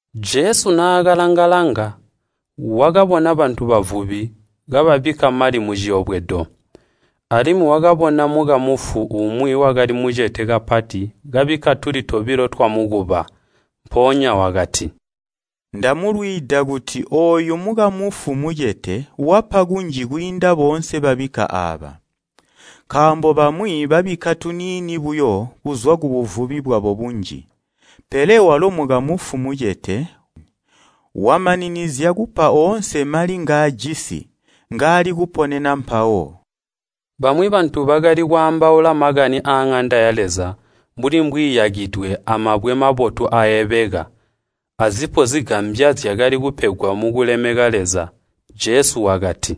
Jesu naakalanga-langa, wakabona bantu bavubi kababikka mali muciyobwedo. Alimwi wakabona mukamfu umwi wakali mucete kapati kabikka tuli tobilo twamukuba. Mpoonya wakati, “Ndamulwiida kuti ooyu mukamufu mucete wapa kunji kwiinda boonse babikka aaba. Nkaambo bamwi babikka tuniini buyo kuzwa kubuvubi bwabo bunji. Pele walo mukamufu mucete, wamaninizya kupa oonse mali ngaajisi, ngaali kuponena mpawo.” Bamwi bantu bakali kwaambaula makani aaŋanda ya Leza, mbuli mbwiiyakidwe amabwe mabotu aaebeka, azipo zigambya zyakali kupegwa mukulemeka Leza. Jesu wakati,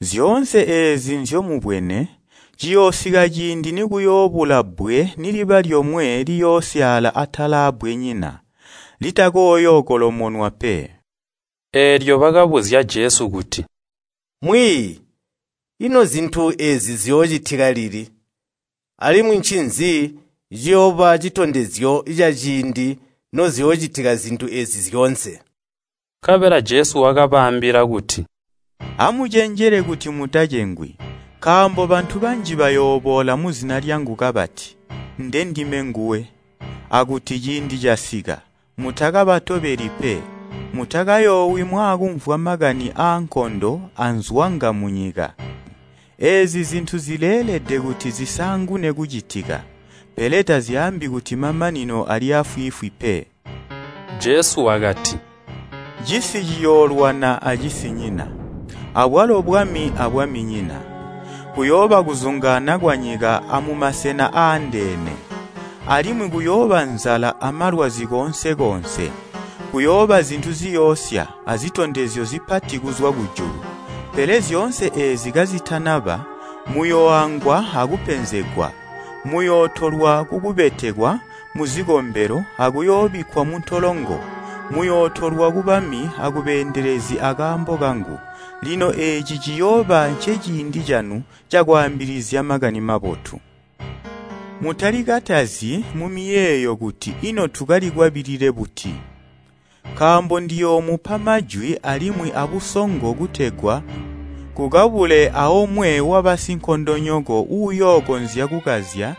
“Zyoonse eezi nzyomubwene, ciyoosika ciindi nikuyoobula bbwe niliba lyomwe liyoosyaala atala aabbwenyina litakoyookolomonwa pe.” Eelyo bakabuzya Jesu kuti, “Mwiiyi, ino zintu eezi ziyoocitika lili? Alimwi ncinzi ciyooba citondezyo caciindi noziyoocitika zintu eezi zyoonse?” Nkabela Jesu wakabaambila kuti, “Amucenjele kuti mutacengwi. Nkaambo bantu banji bayooboola muzina lyangu kabati, ‘Ndendime nguwe!’ akuti ‘Ciindi casika!’ Mutakabatobeli pe. Mutakayoowi mwaakumvwa makani aankondo anzwanga munyika. Eezi zintu zileelede kuti zisaangune kucitika, pele tazyaambi kuti mamanino ali aafwiifwi pe.” Jesu wakati, “Cisi ciyoolwana acisinyina, abwalo bwami abwaminyina. Kuyooba kuzungaana kwanyika amumasena aandeene, alimwi kuyooba nzala amalwazi koonse koonse, kuyooba zintu ziyoosya, azitondezyo zipati kuzwa kujulu. Pele zyoonse eezi kazitana ba, muyooangwa akupenzegwa, muyootolwa kukubetekwa muzikombelo akuyoobikkwa muntolongo, muyootolwa kubami akubeendelezi akaambo kangu. “Lino eeci ciyooba nceciindi canu cakwaambilizya Makani Mabotu. Mutalikatazyi mumiyeeyo kuti ino tukalikwabilile buti? Nkaambo ndiyoomupa majwi alimwi abusongo kutegwa kukabule aomwe wabasinkondonyoko uyookonzya kukazya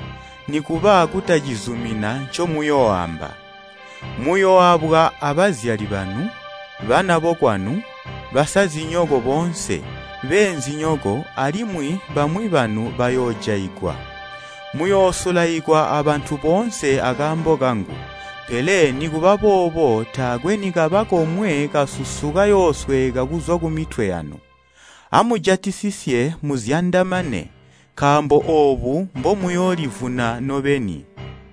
nikuba kutacizumina ncomuyooamba. Muyooabwa abazyali banu, bana bokwanu, basazinyoko boonse, beenzinyoko, alimwi bamwi banu bayoojaigwa. Muyoosulaikwa abantu boonse akaambo kangu. Pele nikubaboobo taakwe nikaba komwe kasusu kayoosweeka kuzwa kumitwe yanu. Amujatisisye muzyandamane, nkaambo oobu mbomuyoolivuna nobeni.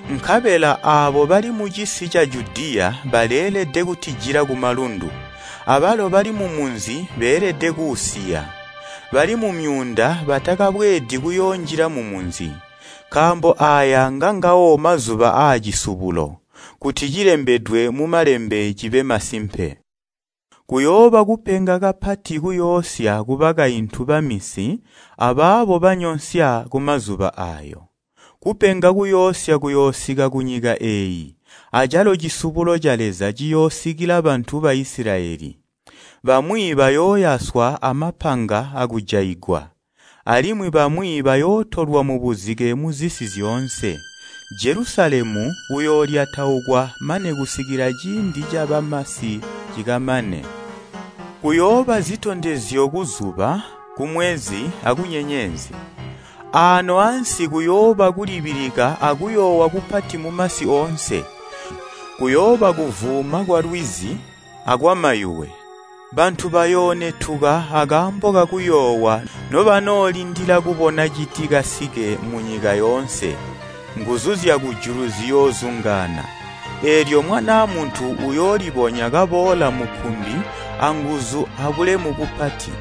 Nkabela aabo bali mucisi ca Judiya baleelede kutijila kumalundu, abalo bali mumunzi beelede kuusiya, bali mumyuunda batakabweedi kuyoonjila mumunzi. Nkaambo aaya ngangawo ‘Mazuba aa Cisubulo,’ kuti cilembedwe mu Malembe cibe masimpe. Kuyooba kupenga kapati kuyoosya kubakaintu baminsi abaabo banyonsya kumazuba aayo! Kupenga kuyoosya kuyoosika kunyika eeyi, acalo cisubulo ca Leza ciyoosikila bantu Baisilayeli. Bamwi bayooyaswa amapanga akujaigwa, alimwi bamwi bayootolwa mubuzike muzisi zyoonse, Jelusalemu uyoolyataukwa mane kusikila ciindi cabamasi cikamane. “Kuyooba zitondezyo kuzuba, kumwezi, akunyenyezi. Aano ansi kuyooba kulibilika akuyoowa kupati mumasi oonse, kuyooba kuvuuma kwalwizi akwamayuwe. Bantu bayoonetuka akaambo kakuyoowa nobanoolindila kubona citikasike munyika yoonse, nguzu zyakujulu ziyoozungaana. Eelyo Mwanaa Muntu uyoolibonya kaboola mukkumbi anguzu abulemu bupati.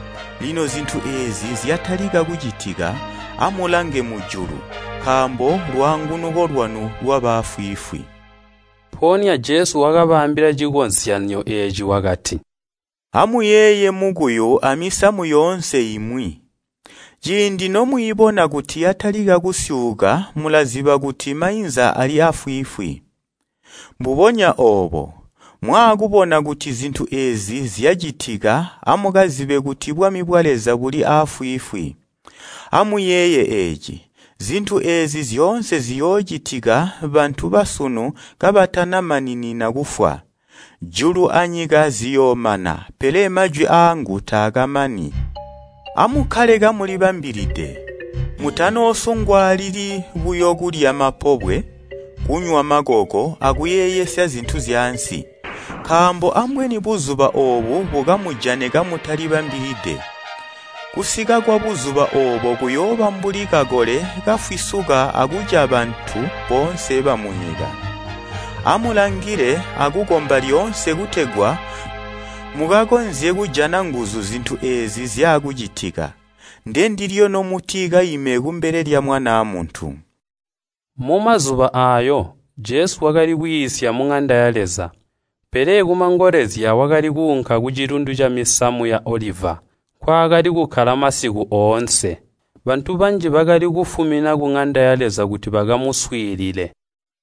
Lino zintu eezi zyatalika kucitika, amulange mujulu, nkaambo lwaangunuko lwanu lwaba aafwiifwi.” Mpoonya Jesu wakabaambila cikozyanyo eeci wakati, “Amuuyeeye mukuyu amisamu yoonse imwi. Ciindi nomwiibona kuti yatalika kusyuuka mulaziba kuti mainza ali aafwiifwi. Mbubonya obo, mwaakubona kuti zintu eezi zyacitika amukazibe kuti bwami bwa Leza buli aafwiifwi. “Amuyeeye eeci! Zintu eezi zyoonse ziyoocitika bantu basunu kabatanamaninina kufwa. Julu anyika ziyoomana, pele majwi aangu taakamani. “Amukkale kamulibambilide! Mutanoosungwaalili buyo kulya mapobwe, kunywa makoko akuyeeyesya zintu zyaansi, nkaambo ambweni Buzuba oobu bukamujane kamutalibambilide. Kusika kwa Buzuba oobo kuyooba mbuli kakole kafwisuka akuca bantu boonse bamunyika. Amulangile akukomba lyoonse kutegwa mukakonzye kujana nguzu zintu eezi zyaakucitika. Ndendilyo nomuti kaime kumbele lya Mwanaa Muntu.” Mumazuba aayo, Jesu wakali kwiisya muŋanda ya Leza, pele kumangolezya wakali kuunka kucilundu camisamu ya Oliva nkwaakali kukkala masiku oonse. Bantu banji bakali kufumina kuŋanda ya Leza kuti bakamuswiilile.